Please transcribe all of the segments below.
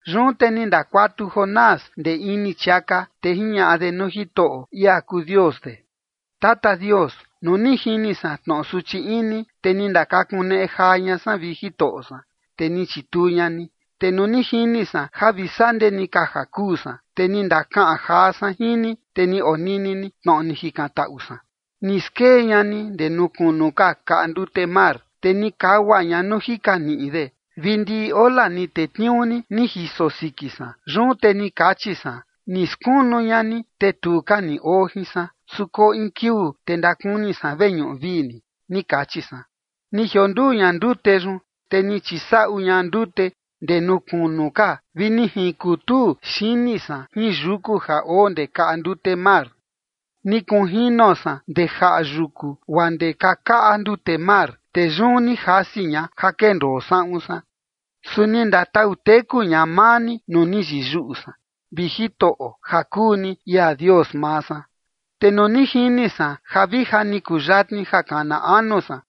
Yun te ni ndakuatu Jonás ndee ini chiaka, te jiñaꞌa de nuu Jitoꞌo, ia kuu Dios de: Tata Dios, nuu ni jini san tnoꞌo suchi ini, te ni ndakakuneꞌe jaa ña san, vi Jitoꞌo san, te ni chituu ña ni. Te nuu ni jini san ja vi sandee ni ka ja kuu san, te ni ndakaꞌan jaa san jin ni, te ni onini ni tnoꞌo ni jikantaꞌu san. Ni skee ña ni ndee nuu kunu ka kaꞌa ndute mar, te ni kagua ña nuu jika niꞌi de, vi ndiꞌi ola ni tetniuu ni, ni jiso siki san. Yun te ni kachi san: “Ni skunu ña ni, te tu ka ni oo jin san. Su koo in kiuu, te ndakuni san veñuꞌu vii ni” ni kachi san. Ni jionduu ña ndute yun, te ni chisaꞌu ña ndute ndee nuu kunu ka, vi ni jinkuntuu xini san jin yuku ja oo ndee kaꞌa ndute mar. Ni kunjino san ndee jaꞌa yuku guaa ndee kakaꞌa ndute mar, te yun ni jasi ña ja kendoo saꞌun san. Su ni ndatau teku ña maa ni nuu ni yiyuꞌu san, vi Jitoꞌo, ja kuu ni ia Dios maa san. Te nuu ni jini san ja vija ni kuyatni ja kana anu san,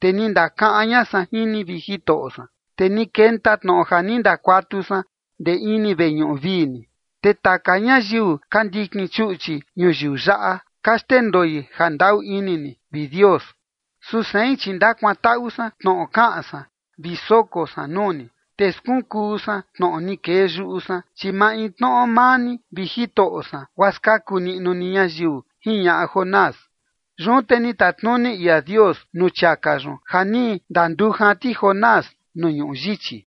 te ni ndakaꞌan ña san jin ni, vi Jitoꞌo san, te ni kenta tnoꞌo ja ni ndakuatu san ndee ini veñuꞌu vii ni. Te taka ñayiu ka ndikin chuꞌchi ñuyiu yaꞌa, ka xndendoi jandaꞌu ini ni, vi Dios. Su sein, chi ndakuantaꞌu san tnoꞌo kaꞌan san vi soko san nuu ni. Te skunkuu san tnoꞌo ni kee yuꞌu san, chi maintnoꞌo maa ni, vi Jitoꞌo san, guaa skaku niꞌnu ni ñayiu jiñaꞌa Jonás. Yun te ni tatnuni ia Dios nuu chiaka yun ja ni ndandujan ti Jonás nuu ñuꞌu yichi.